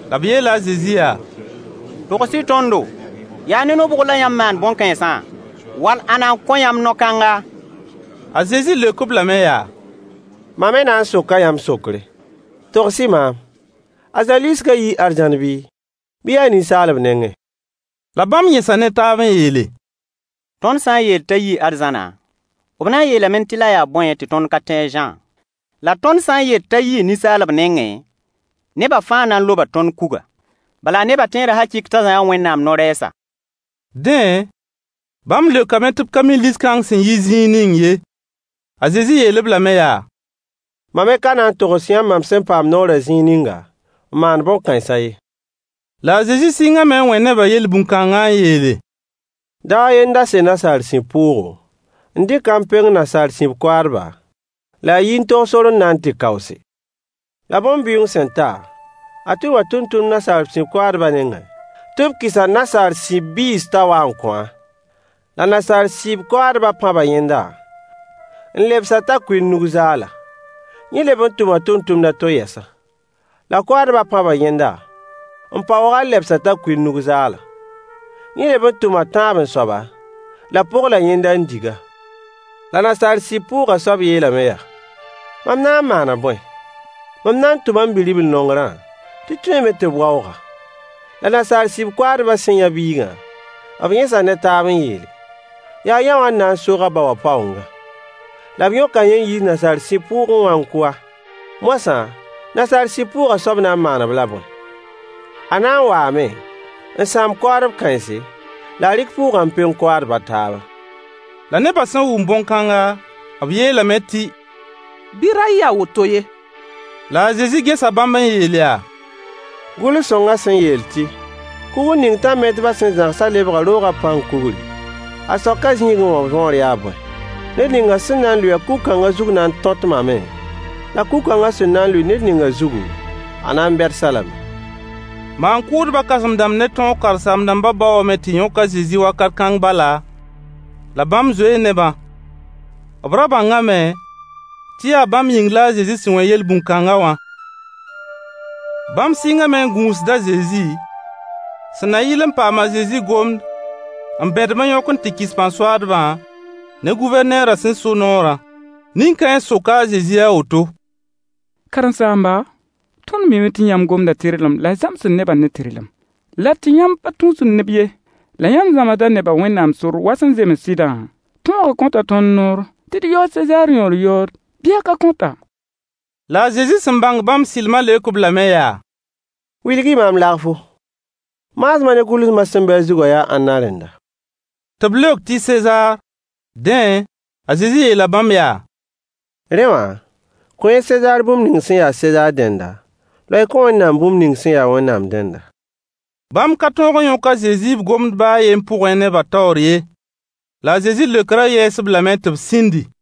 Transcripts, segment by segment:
La b yeela a Zezi yaa: Togs-y tõndo: Yaa ne no-bʋg la yãmb maand bõn-kãensã, wall ãnna n kõ yãmb no-kãnga. A Zezi leok-b lame yaa: Mam me na n soka yãmb sokre. Togs-y maam: A Zã lisgã yii arzãn bii, bɩ yaa ninsaalb nengẽ? La bãmb yẽsa ne taab n yeele: Tõnd sã n yeel t'a yii arzãna, b na n yeelame tɩ la yaa bõe tɩ tõnd ka tẽ a Zã, la tõnd sã n yet t'a yii ninsaalb nengẽ, neba fãa na n loba tõnd kuga, bala neba tẽeda hakɩɩk t'a Zã yaa Wẽnnaam no-rɛɛsa. Dẽ bãmb leokame tɩ b ka mi lis-kãng sẽn yi zĩig ning ye. A Zezi yeel-b lame yaa: Mam me ka na n togs yãmb mam sẽn paam noorã zĩig ninga n maand bõn-kãensã ye. La a Zezi sɩngame n wẽ neba yel-bũn kãnga n yeele: Dao a ye n da sel nasaar sib pʋʋgo, n dɩk-a n peng nasaar sib koaadba, la a yi n tog sor n na n tɩ kaoose. La bõn-bɩʋʋng sẽn ta, a tʋma tʋmtʋmd nasaar sib koaadbã nengẽ tɩ b kis-a nasaar sib biis t'a wa n kõ-a. La nasaar sib koaadbã pãba yẽnda n lebs-a t'a kuil nug-zaala. Yẽ leb n tʋma tʋmtʋmd a to Yɛsa. La koaadbã pãba yẽnda n paoog-a n lebs-a t'a kuil nug-zaala. Yẽ leb n tʋma tãabẽ soaba, la b pogla yẽnda n dig-a. La nasaar sib pʋʋgã soab yeelame yaa: “Mam na n maana bõe? Mam na n tʋma m bi-ribl-nongrã tɩ tõeeme tɩ b waoog-a.” La nasaar sib koaadbã sẽn yã biigã, b yẽsa ne taab n yeele: “Yaa yõwã n na n soog a ba wã paoongã.” La b yõka yẽ n yiis nasaar sib pʋʋgẽ wã n kʋ-a. Moasã nasaar sib pʋʋgã soab na n maan-b-la bõe? A na n waame, n sãam koaadb-kãense, la a rɩk pʋʋgã n peng koaadb a taaba. La nebã sẽn wʋm bõn-kãnga, b yeelame tɩ: Bɩ ra yɩ a woto ye. La a Zezi gesa bãmb n yeel yaa: Gʋlsg sõngã sẽn yeel tɩ: “Kugr ning tãn-metbã sẽn zãgsã lebga roogã pãng kugri, a soaka zĩigẽ wã” võor yaa bõe? Ned ninga sẽn na n lʋɩ-a kug-kãnga zug na n tõtmame, la kug-kãnga sẽn na n lʋɩ ned ninga zugu, a na n beds-a lame. Zemsame tɩ yao Sezaar yõor yaoodo? Maan-kʋʋdbã kãsem-dãmb ne tõog karen-saam-dãmbã baoome tɩ yõk a Zezi wakat kãng bala, la bãmb zoee nebã. B ra bãngame tɩ yaa bãmb yĩng la a Zezi sẽn wẽ yel-bũn kãngã wã. Bãmb sɩngame n gũusd a Zezi, sẽn na yɩl n paam a Zezi gomd n bẽd-b n yõk n tɩ kɩs pãn-soaadbã ne Gʋvɛrneerã sẽn so noorã. Nin-kãens soka a Zezi a woto: Karen-saamba, tõnd miime tɩ yãmb gomda tɩrlem la y zãmsd nebã ne tɩrlem, la tɩ yãmb ka tũusd neb ye. La yãmb zãmsda nebã Wẽnnaam sor wa sẽn zems sɩdã. Tõogã kõta tõnd noor tɩ d yao Sezaar yõor yaood bɩ a ka kõta? La a Zezi sẽn bãng bãmb sɩlma leok-b lame yaa: Wilg-y maam lagfo. Maasmã ne gʋlsemã sẽn be a zugã yaa ãnna rẽnda? Tɩ b leok tɩ Sezaar. Dẽ, a Zezi yeela bãmb yaa: Rẽ wã, kõ-y Sezaar bũmb ning sẽn ya Sezaar dẽnda, la y kõ Wẽnnaam bũmb ning sẽn ya Wẽnnaam dẽnda. Bãmb ka tõog n yõk a Zezi b gomd baa a yen pʋgẽ nebã taoor ye. La a Zezi leokrã yɛɛs-b lame tɩ b sĩndi.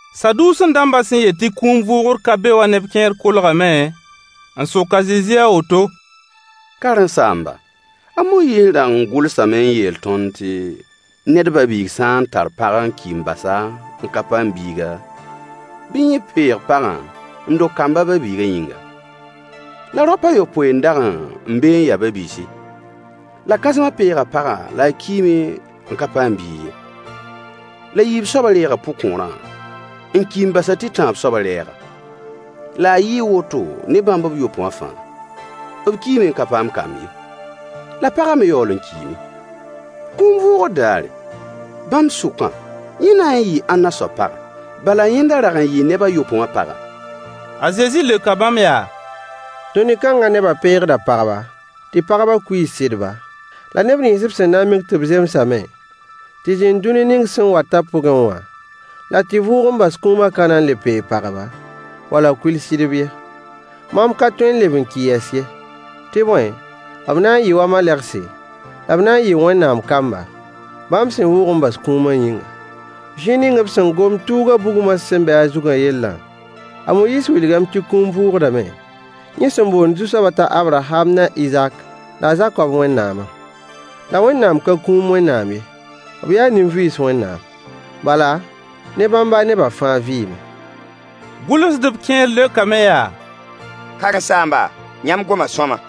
Saduusẽ-dãmba sẽn yet tɩ kũum vʋʋgr ka be wã neb kẽer kolgame n sok a Zezi a woto: Karen-saamba, a Moyiis dag n gʋlsame n yeel tõnd tɩ: “Ned ba-biig sã n tar pag n ki n bas-a n ka paam biiga, bɩ yẽ peeg pagã n dog kamb a ba-biigã yĩnga.” La raop a yopoe n dag n be n ya ba-biisi. La kãsma peega paga la a kiime n ka paam biig ye. La yiib soabã reega pʋgkõorã, n ki n bas-a tɩ tãab soaba reeg-a. La a yɩɩ woto ne bãmb b yopoe wã fãa, b kiime n ka paam kamb ye. La pagã me yaool n kiime. Kũum vʋʋgr daare, bãmb sʋkã, yẽ na n yɩɩ ãnna soab paga? Bala yẽnda rag n yɩɩ neb a yopoe wã paga. A Zezi leoka bãmb yaa: Dũni kãnga nebã peegda pagba tɩ pagba kuiis sɩdba, la neb nins b sẽn na n mik tɩ b zemsame tɩ zĩnd dũni ning sẽn watã pʋgẽ wã la tɩ vʋʋg n bas kũumã ka na n le peeg pagba, wala kuil sɩdb ye. Bãmb ka tõe n leb n ki yɛs ye, tɩ bõe, b na n yɩɩ wa malegse, la b na n yɩɩ Wẽnnaam kamba, bãmb sẽn vʋʋg n bas kũumã yĩnga. Zĩig ning b sẽn gomd tuugã bugma sẽn be a zugã yellã, a Moyiis wilgame tɩ kũum vʋʋgdame, yẽ sẽn boond Zu-soabã t'a Abraham ne a Izak la a Zakob Wẽnnaamã. La Wẽnnaam ka kũum Wẽnnaam ye, b yaa nin-vɩɩs Wẽnnaam. Bala ne bãmba neba fãa vɩɩme. Gʋlsdb kẽer leokame yaa: Karen-saamba, yãmb goma sõama.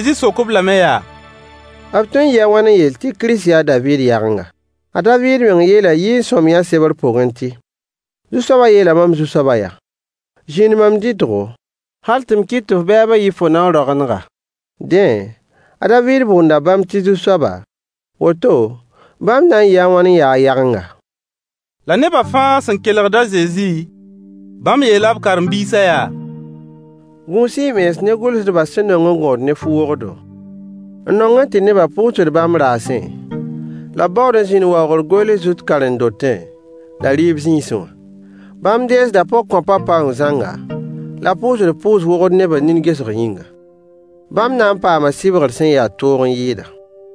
A Zezi sok-b lame yaa: B tõe n yɩɩ a wãn n yeel tɩ Kirist yaa a Daviid yagenga? A Daviid meng yeela yɩɩn-sõamyã sebr pʋgẽ tɩ: “Zu-soaba yeela mam Zu-soaba yaa: Zĩnd mam dɩtgo, hal tɩ m kɩt f bɛɛba yɩ fo nao roagendga.” Dẽ, a Daviid boonda bãmb tɩ Zu-soaba, woto bãmb na n yɩɩ a wãn n yaa a yagenga? La nebã fãa sẽn kelgd a Zezi, bãmb yeela b karen-biisã yaa: Gũus-y y mens ne gʋlsdbã sẽn nong n gõod ne fu-wogdo, n nongẽ tɩ neba pʋʋsd bãmb raasẽ, la b baood n zĩnd waoogr goeels zut karen-dotẽ, la rɩɩb zĩisẽ wã. Bãmb deesda pʋgkõapã paoong zãnga la b pʋʋsd pʋʋs-wogd nebã nin gesg yĩnga. Bãmb na n paama sɩbgr sẽn ya toog n yɩɩda.